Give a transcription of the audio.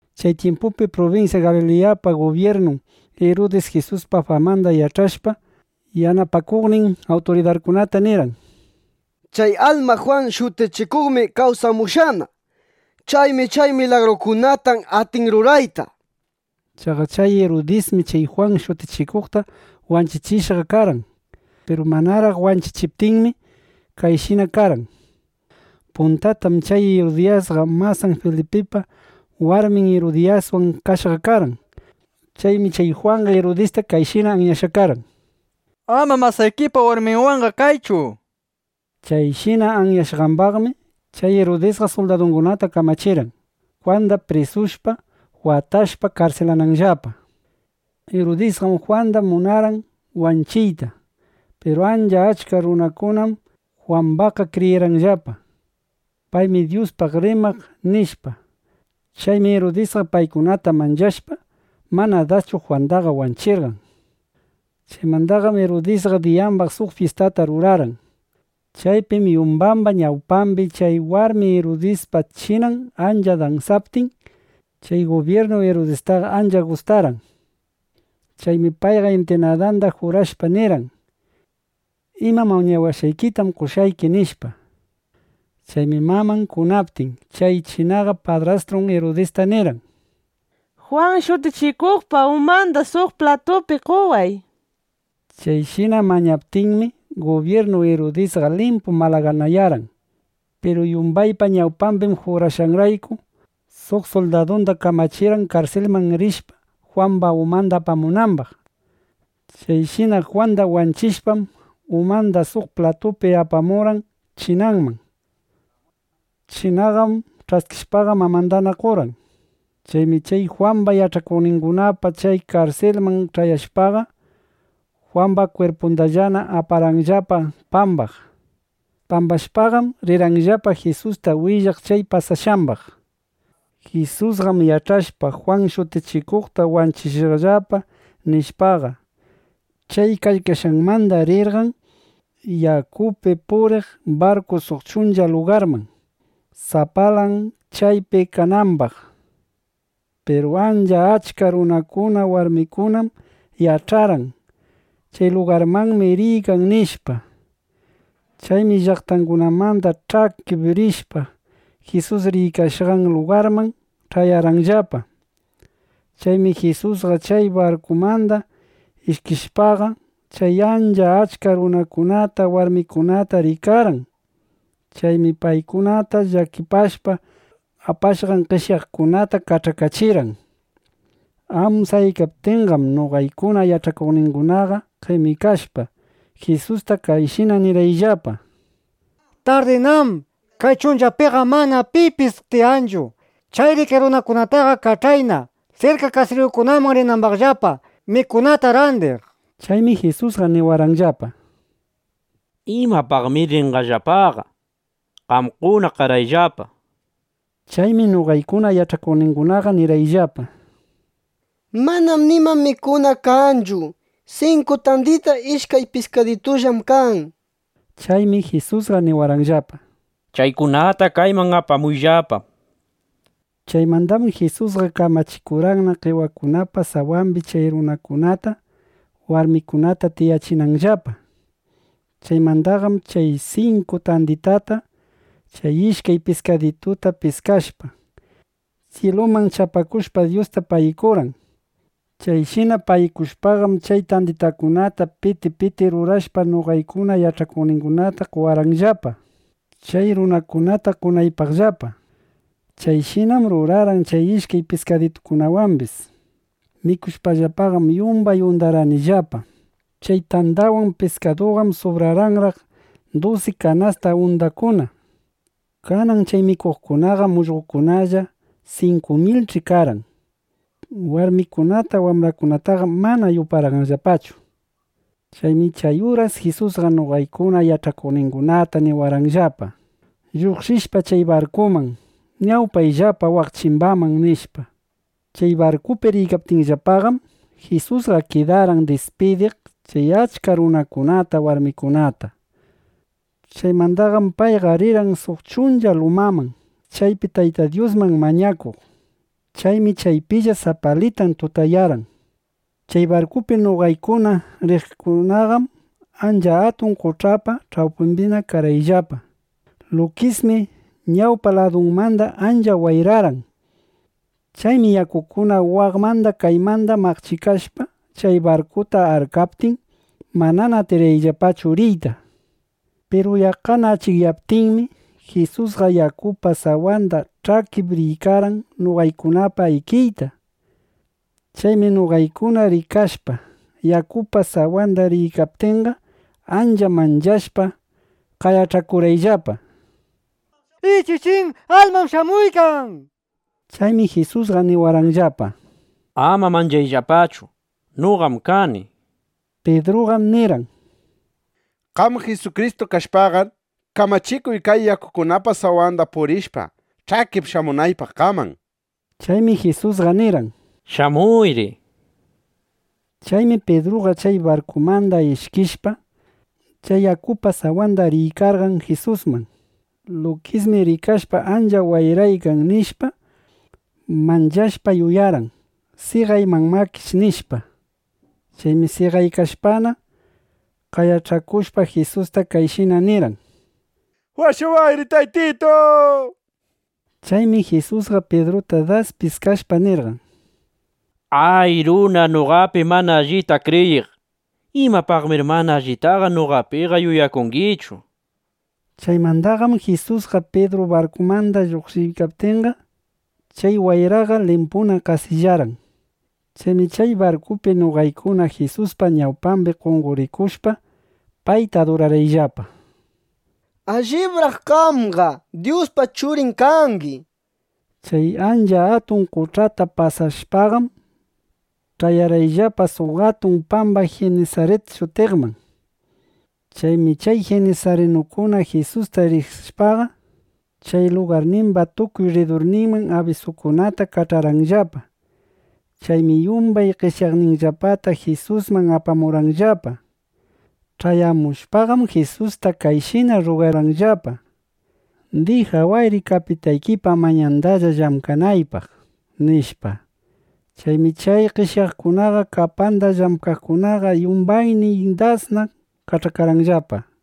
Chay tyimpupi prubinsya Galiliyapa gubyirnun Irudis Jisuspa famanda yach'ashpa, yanapakuqnin awturidarkunata nirqan: —Chay alma Jwan Shutichikuqmi kawsamushqana. Chaymi chay milagrukunata atin rurayta, nishpa. Chaqa chay Irudismi chay Jwan Shutichikuqta wanchichishqa karqan. Piru manaraq wanchichiptinmi, kayshina karqan. Puntatam chay Irudisqa masan Filipipa warmin Irudiyaswan kashqa karqan. Chaymi chay Jwanqa Irudista kayshina anyashqa karqan: —Ama masaykipa warminwanqa kaychu, nishpa. Chayshina anyashqambaqmi chay Irudisqa suldadungunata kamachirqan, Jwandaqa prisushpa, watashpa, karsilananllapa. Irudisqam Jwanda munarqan wanchichiyta. Piru ancha achka runakunam Jwambaqqa kriyirqanllapa: Paymi Dyuspaq rimaq, nishpa. Chaymi Irudisqa paykunata manchashpa, mana daschu Jwandaqa wanchichirqan. Chaymandaqam Irudisqa diyambaq suq fyistata rurarqan. Chaypim yumbaypa ñawpambi chay warmi Irudiyaspa chinan ancha dansaptin, chay gubyirnu Irudistaqa ancha gustarqan. Chaymi payqa intinadanda jurashpa nirqan: —Ima mañawashqaykitam qoshqayki, nishpa. Chaymi maman kunaptin, chay chinaqa padrastun Irudista nirqan: —Jwan Shutichikuqpa umanda suq platupi qoway, nishpa. Chayshina mañaptinmi, gubyirnu Irudisqa limpu malaganayarqan. Piru yumbaypa ñawpambi jurashqanraykum, suq suldadunda kamachirqan, karsilman rishpa, Jwamba umanda apamunambaq. Chayshina Jwanda wanchishpam, umanda suq platupi apamurqan chinaman. Chinaqam ch'askishpaqa, mamandana qorqan. Chaymi chay Jwamba yach'akuqningunaqa chay karsilman ch'ayashpaqa, Jwamba kwirpundallana aparqanllapa pambaq. Pambashpaqam, rirqanllapa Jisusta willaq chay pasashqambaq. Jisusqam yach'ashpa, Jwan Shutichikuqta wanchishqallapa, nishpaqa, chay kaykashqanmanda rirqan yakupi puriq barkupi suq chuncha lugarman, sapalan chaypi kanambaq. Piru ancha achka runakuna, warmikunam yach'arqan: Chay lugarmanmi riykan, nishpa. Chaymi llaqtangunamanda ch'akip rishpa, Jisus riykashqan lugarman ch'ayarqanllapa. Chaymi Jisusqa chay barkumanda ishkishpaqa, chay ancha achka runakunata, warmikunata rikarqan. Chaymi paykunata llakipashpa, apashqan qeshyaqkunata kach'akachirqan. Amsayaykaptinqam noqaykuna yach'akuqningunaqa qemikashpa, Jisusta kayshina nirqayllapa: —Tardinám. Kay chunchapiqam mana pipis tiyanchu. Chayri kay runakunataqa kach'ayna, sirka kasiriyukunaman rinambaqllapa, mikunata randiq, nishpa. Chaymi Jisusqa niwarqanllapa: —¿Imapaqnamir rinqallapaqa? Qamkuna qarayllapa, nishpa. Chaymi noqaykuna yach'akuqningunaqa nirqayllapa: —Manam nima mikuna kanchu. Sinku tandita, ishkay piskaditullam kan, nishpa. Chaymi Jisusqa niwarqanllapa: —Chaykunata kayman apamuyllapa, nishpa. Chaymandaqam Jisusqa kamachikurqanna qewakunapa sawambi chay runakuna, warmikuna tiyanambaqllapa. Chaymandaqam chay sinku tanditata, chay ishkay piskadituta piskashpa, syiluman chapakushpa, Dyusta pagikurqan. Chayshina pagikushpaqam, chay tanditakunata piti piti rurashpa, noqaykuna yach'akuqningunata qowarqanllapa, chay runakunata qonaypaqllapa. Chayshinam rurarqan chay ishkay piskadituwambis. Mikushpallapaqam yumbay undarqanillapa. Chay tandawan piskaduqam subrarqanraq dusi kanasta undakuna. Kanan chay mikuqkunaqam ullqokunalla 5.000ch'i karqan. Warmikunata, wambrakunataqam mana yuparqayllapachu. Chaymi chay uras Jisusqa noqaykuna yach'akuqningunata niwarqanllapa: —Lluqshishpa chay barkuman, ñawpayllapa waq chimbaman, nishpa. Chay barkupi riykaptiyllapaqam, Jisusqa kidarqan dispidiq chay achka runakunata, warmikunata. Chaymandaqam payqa rirqan suq chuncha lumaman, chaypi Tayta Dyusman mañakuq. Chaymi chaypilla sapalitan tutayarqan. Chay barkupi noqaykuna riykaqqam ancha atun qoch'apa ch'awpimbina karqayllapa. Lukismi ñawpa ladumanda ancha wayrarqan. Chaymi yakukuna waqmanda kaymanda maqchikashpa chay barkuta arkaptin, manana atirqayllapachu riyta. Piru yaqqana achikyaptinmi, Jisusqa yakupa sawanda ch'akip riykarqan noqaykunapa ikiyta. Chaymi noqaykuna rikashpa, yakupa sawanda riykaptinqa, ancha manchashpa qayach'akurqayllapa: —¡Ichichín, almam shamuykan! nishpa. Chaymi Jisusqa niwarqanllapa: —Ama manchayllapachu. Noqam kani, nishpa. Pidruqam nirqan: —Qam Jisukristu kashpaqar, kamachikuy, kay yakukunapa sawanda purishpa, ch'akip shamunaypaq qaman, nishpa. Chaymi Jisusqa nirqan: —Shamuyri, nishpa. Chaymi Pidruqa chay barkumanda ishkishpa, chay yakupa sawanda riykarqan Jisusman. Lukismi rikashpa ancha wayraykan, nishpa, manchashpa, yuyarqan: seqayman imakish, nishpa. Chaymi seqaykashpana, qayach'akushpa, Jisusta kayshina nirqan: —¡Washawayri, Taytitu! nishpa. Chaymi Jisusqa Pidruta das piskashpa, nirqan: —¡A, runa noqapi mana allita kriyiq! ¿Imapaqmír mana allitaqa noqapiqa yuyakungichu? nishpa. Chaymandaqam Jisuswan Pidru barkumanna lluqshiptinqa, chay wayraqa limpuna qasillarqan. Chaymi chay barkupi noqaykuna Jisuspa ñawpambi qonqorikushpa, payta adurarqayllapa, —¡Allibraq qamqa Dyuspa Churin kangi! nishpa. Chay ancha atun qoch'ata pasashpaqam, ch'ayarqayllapa suq atun pamba Jinisarit shutiqman. Chaymi chay jinisarinukuna Jisusta riqsishpaqa, chay lugarnimba tukuy rridurninman abisukunata kach'arqanllapa. Chaymi yumbay qeshyaqninllapata Jisusman apamurqanllapa. Ch'ayamushpaqam Jisusta kayshina rrugarqanllapa: —Dijawayri kapitaykipa manyandalla llamkanaypaq, nishpa. Chaymi chay qeshyaqkuna kapanda llamkaqkunaqa yumbaynin das kach'akarqanllapa.